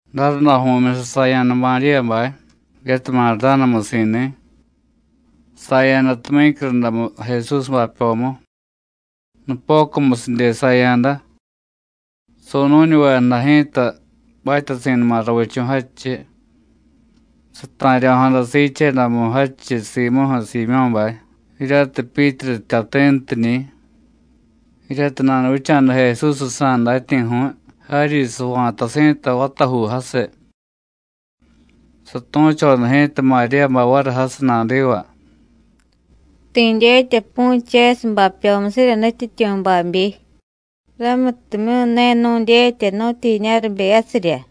Darundaju̱myusiy saya̱da Maríyabay, jiryatiy Mardánamusi̱ni̱. Saya̱da tumyícyurundamu Jesús bapyomu. Nupocumusidye saya̱da. Su̱nu̱ñuvejada ji̱ta batyasi̱numa ravichu̱ jadchiy. Sata̱ryo̱jada siichedamu jadchiy simuju̱ Siimyó̱bay, jiryatiy Pyítru jtyati̱ntiñi̱, jiryatiy nanuvicha̱da Jesúsjsa̱ datyi̱ju̱y jaryi sava̱tasi̱ta vatajuu jasiy. Satu̱choda ji̱ta Maríyabay variy jasiy nadiva: “Ti̱ dyetya pu̱chesiy bapyomusirya Nutyityu̱ babyi, ramutimyu̱ ne nu̱dyetya nu̱tyijiña̱ ribeyasirya.”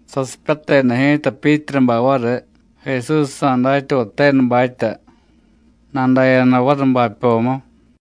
Sasipyateda ji̱ta Pyítrubay variy, Jesúsjsa̱ datyavay tenubatya, nadaya̱da variy bapyomu.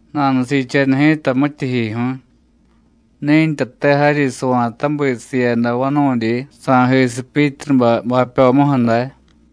Nanusiicheda ji̱ta mityijyijyu̱y, ni̱ntyate jaryi sava̱tabi siiyada vanu̱dyi sa̱jisiy Pyítrubay bapyomuju̱ day.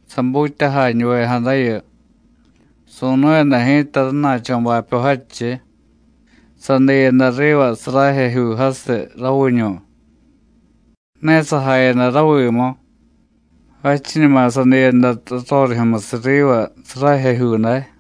Sabutyajañuvejadayu, su̱nu̱yada ji̱ta rana̱cho̱ bapyo jadchiy, sadiyada riva sarajejyuu jasiy, raviñu̱. Ne sajayada ramu, jadchiñuma sadiyada rarorijyu̱musiy riva sarajejyuu day.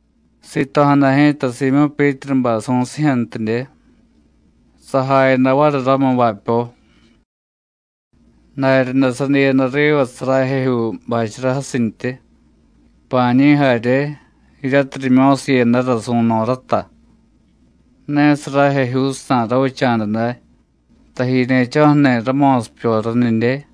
Sito̱jada ji̱ta Siimyó̱ Pyítrubay su̱sijyu̱ntidye, sajayada variy ramu bapyo. Daryaday sadiyada riva sarajejyuu bachara jasintyi, pa̱a̱ñi̱ jarye, jiryatiy rimyo̱siiyadara su̱no̱ rata. Ne sarajejyuujsa̱ ravicha̱da day, tajiñe̱cho̱ju̱ni̱ ramo̱sipyoranidye.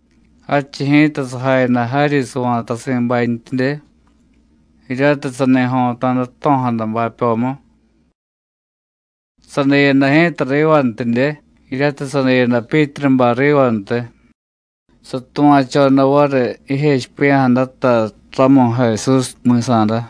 Jadchiy ji̱ta sajayada jaryi sava̱tasi̱bantyidye, jiryatiy sani jo̱ta̱da jto̱jada bapyomu. Sadiyada ji̱ta rivantidye, jiryatiy sadiyada Pyítrubay rivantiy, satuva̱choda variy jijechipiya̱jadata ramu Jesús mi̱sa̱da.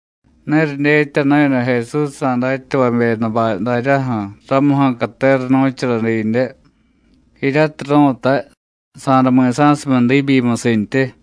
Ne ridyetyanu̱yada Jesúsjsa̱ datyavavyedabay daryaju̱ ramuju̱ catera nu̱chara didye, jiryatiy ru̱tay: “Sa̱day mi̱sa̱sumiy diibyimusintyi.”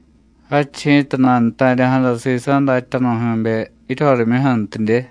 Jadchiy ji̱ta nanuta̱rya̱jada sisa̱ datyanu̱jyu̱be jiryorimyuju̱ntidye.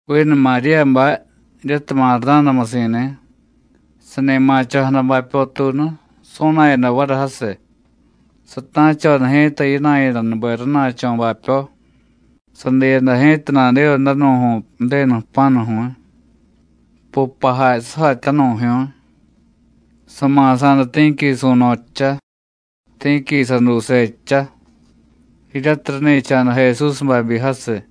Vinu Maríyabay, jiryatiy Mardánamusi̱ni̱, sani ma̱cho̱jada bapyotuunu, su̱na̱yada variy jasiy. Sata̱choda ji̱ta yina̱yadanube rana̱cho̱ bapyo, sadiyada ji̱ta nadiva danu̱ju̱y Ju̱denu jpa̱nu̱ju̱y, pupajay sujatyanu̱jyu̱y. Sama̱sa̱da ti̱qui su̱no̱ jcha, ti̱qui saduuse jcha, jiryatiy rani̱cha̱da Jesús babyi jasiy.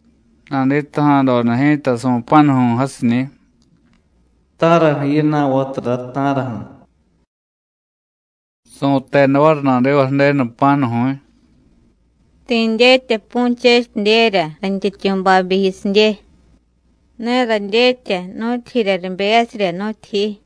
Naditaja̱doda ji̱ta su̱pa̱nuju̱y jasiñi̱: “¿Ta̱raju̱ yina̱y, vatura, ta̱raju̱?” Su̱teda variy nadiva Ju̱denu jpa̱nu̱ju̱y: “Ti̱ dyetya pu̱chesidyerya rayntyityu̱ babyi jiyusidye, ne radyetya nu̱tyijirya ribeyasirya, nu̱tyijiy.”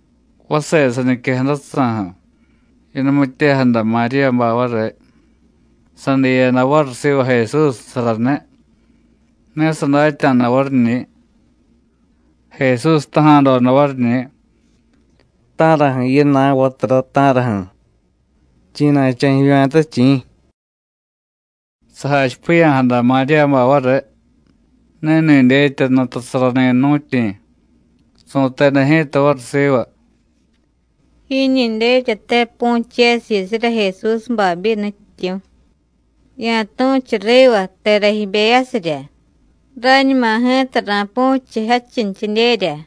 Vase saniquejadajsa̱ju̱, yanumityejada Maríyabay variy, sadiyada variy siva Jesús saraniy, ne sadatya̱da variñi̱. Jesús jtaja̱doda variñi̱: “¿Ta̱raju̱ yina̱y, vatura, ta̱raju̱? ¿Chi̱na̱cho̱ jivya̱ta, chi̱?” Sajachipiya̱jada Maríyabay variy, ni̱ni̱ dyetya nutasarani̱ jnu̱tyi̱. Su̱teda ji̱ta variy siva: “Jiñi dyetyate pu̱chesiy jiyusirya Jesús babyi, Nutyityu̱. Ya̱tu̱chu riva tera jibeyasirya, ra̱ñuma ji̱ta ra̱pu̱chiy jadchintyidyerya.”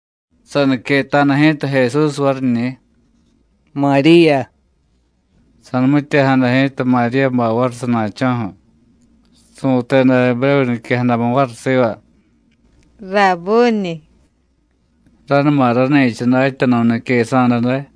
Saniqueta̱da ji̱ta Jesús variñi̱: “¡Maríya!” Sa̱numityejada ji̱ta Maríyabay variy sana̱cho̱ju̱, su̱teda Ebrévu niquejadamu variy siva: “¡Rabbúniy!” ranuma rani̱cha Datyanu̱ niquesa̱da day.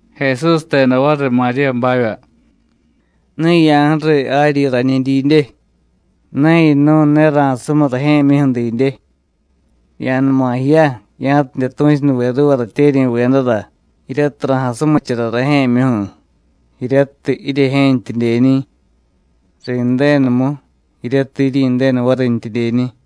Jesús jteda variy Maríyabavya: “Ne ya̱ju̱riy jaryi rañiy didye, ne yinu̱y, ne ra̱sumiy rajye̱myuju̱ didye. Ya̱numa jiya, ya̱tidye tu̱chunuve ruuva ratyeryi̱vedara jiryatiy ra̱jasumichara rajye̱myuju̱, jiryatiy jiryejye̱ntyidyeñi̱; ri̱ndenumu, jiryatiy jiryi̱ndenu varintyidyeñi̱.”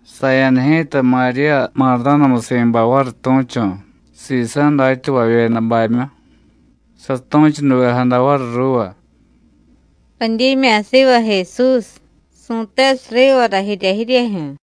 Saya̱da ji̱ta Maríya Mardánamusi̱bay variy tu̱chu̱ sisa̱ datyavavyedabamyu, satu̱chunuvejada variy ruuva: “Radyimya̱ siva Jesús. Su̱tesiy rivara jirya jiryejyu̱.”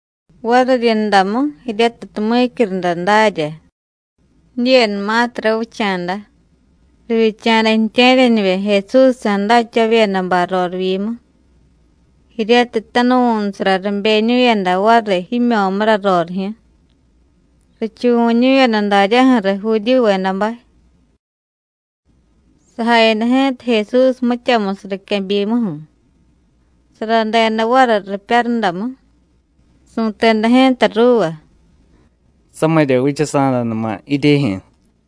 Variryundamu, jiryatiy tumyícyurunda darya, jidyenumatiy ravicha̱da, rivyicha̱da ju̱tye̱ryanivye Jesúsjsa̱ datyavavyedabay rorivyimu, jiryatiy tanuvu̱nusara ribeñu̱yada variy jimyo̱mura rorijyu̱, richuvu̱ñu̱yada daryaju̱riy Judíyuvedabay. Sajayada ji̱ta Jesús mityamusiy riquebyimuju̱, saradeda variy ripyarudamu. Su̱teda ji̱ta ruuva: “Samirya vichasa̱danuma jiryejyu̱.”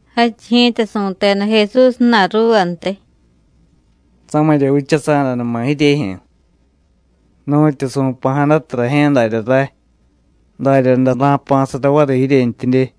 Jadchiy ji̱ta su̱teda Jesús ju̱na̱y ruuvantiy: “Samirya vichasa̱danuma jiryejyu̱. Nu̱tyu su̱pa̱jadatiy rajye̱ darya ray, daryaday ray jpa̱sara variy jiryentyidye.”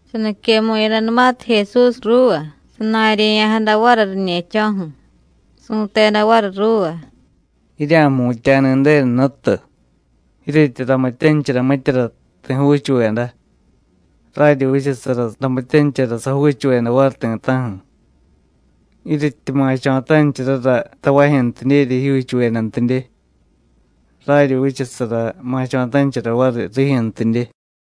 Saniquemu̱yadanumatiy Jesús ruuva, sana̱rye̱ya̱jada variy riñe̱cho̱ju̱, su̱teda variy ruuva: “Jirya̱jmutya̱ni̱ Ju̱denu Jnutu. Jiryetyi ramityanichara mityara ti̱ juuchuveda, raryi vichasara ramityanichara sajuuchuveda variy ti̱ta̱ju̱. Jiryetyi ma̱cho̱tanichara tavajyu̱ntidyerya jijyuuchuvedantidye, raryi vichasara ma̱cho̱tanichara variy rijyu̱ntidye.”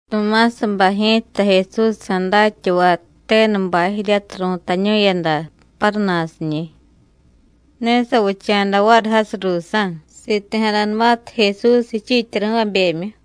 Tumásabay ji̱ta, Jesúsjsa̱ datyavay tenubay jiryatiy ru̱tañu̱yada Páruna̱siñi̱, ne savicha̱da variy jasiy ruusa̱ siti̱jadanumatiy Jesús jichiityari̱vabemyu.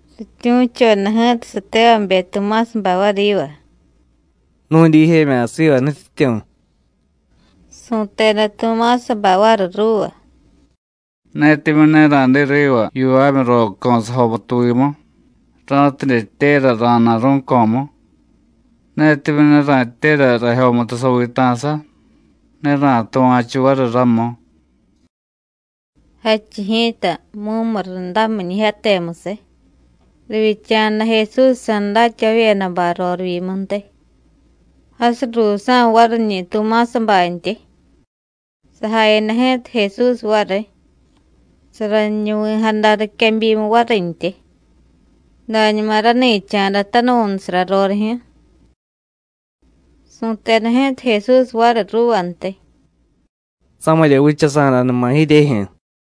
Rityu̱choda ji̱ta satevabe Tumásabay variy yiva: “¡Nu̱y dijemya̱ siva Nutyityu̱!” Su̱teda Tumásabay variy ruuva: “Netimyu̱ ne ra̱diy riva yivamyuroco̱ sajomutuvimu, ra̱tidye jtyera ra̱na̱ rú̱co̱mu, netimyu̱ ne ra̱jtyera rajyomutu saviita̱sa, ne ra̱tuva̱chu variy ramu.” Jadchiy ji̱ta mumurundamiñijyatemusiy, rivyicha̱da Jesúsjsa̱ datyavavyedabay rorivyimuntiy, jasiy ruusa̱ variñi̱ Tumásabantyi. Sajayada ji̱ta Jesús variy, saraniñuvi̱jada riquebyimu varintyi, dañuma rani̱cha̱da tanuvu̱nusara rorijyu̱. Su̱teda ji̱ta Jesús variy ruuvantiy: “Samirya vichasa̱danuma jiryejyu̱.”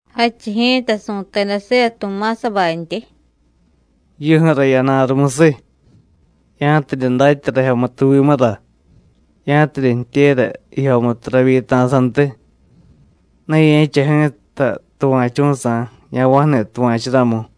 Jadchiy ji̱ta su̱teda siva Tumásabantyi: “Jiyuju̱ra yana̱ rumusiy, ya̱tidye datya rajyomutuvimura; ya̱tidye jtyera jijyomutu ravyita̱santiy. Ne ye̱cha ji̱ta tuva̱chu̱sa̱, ya̱va̱ju̱ni tuva̱chu ramu.”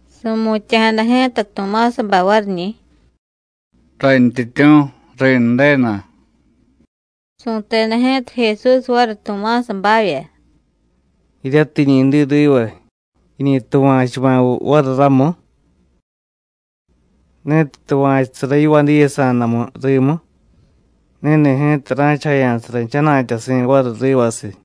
Su̱mutya̱jada ji̱ta Tumásabay variñi̱: “¡Rayntyityu̱, ri̱ndenu!” Su̱teda ji̱ta Jesús variy Tumásabavya: “¿Jiryatiy jiñi diy riva, jiñi tuva̱chuma̱viy variy ramu? Ni̱tiy tuva̱chusara yivadiyasa̱damu rimu, ni̱ni̱ ji̱ta ra̱chajaya̱sara jchana̱tyasi̱ variy rivasiy.”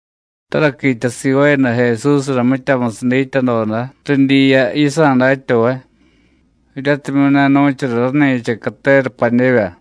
Taraquitya sivaayada Jesúsra mityamusiy dityadoda ridyiya yisa̱ datyavay, jiryatimyu̱ ne nu̱chara rani̱cha catera padyevya.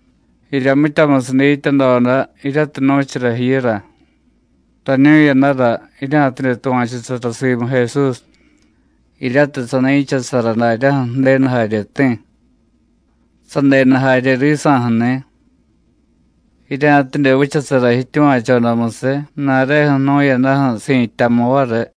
Jirya mityamusiy dityadoda jiryatiy nu̱chara jiyura, rañu̱yadara jirya̱tidye tuva̱chusara simu Jesús, jiryatiy sani̱chasara daryaju̱ Ju̱denu jaryeti̱, sadenu jarye risa̱ju̱ni̱; jirya̱tidye vichasara jityuva̱chodamusiy ju̱na̱reju̱ jnu̱yadaju̱ si̱tyamu variy.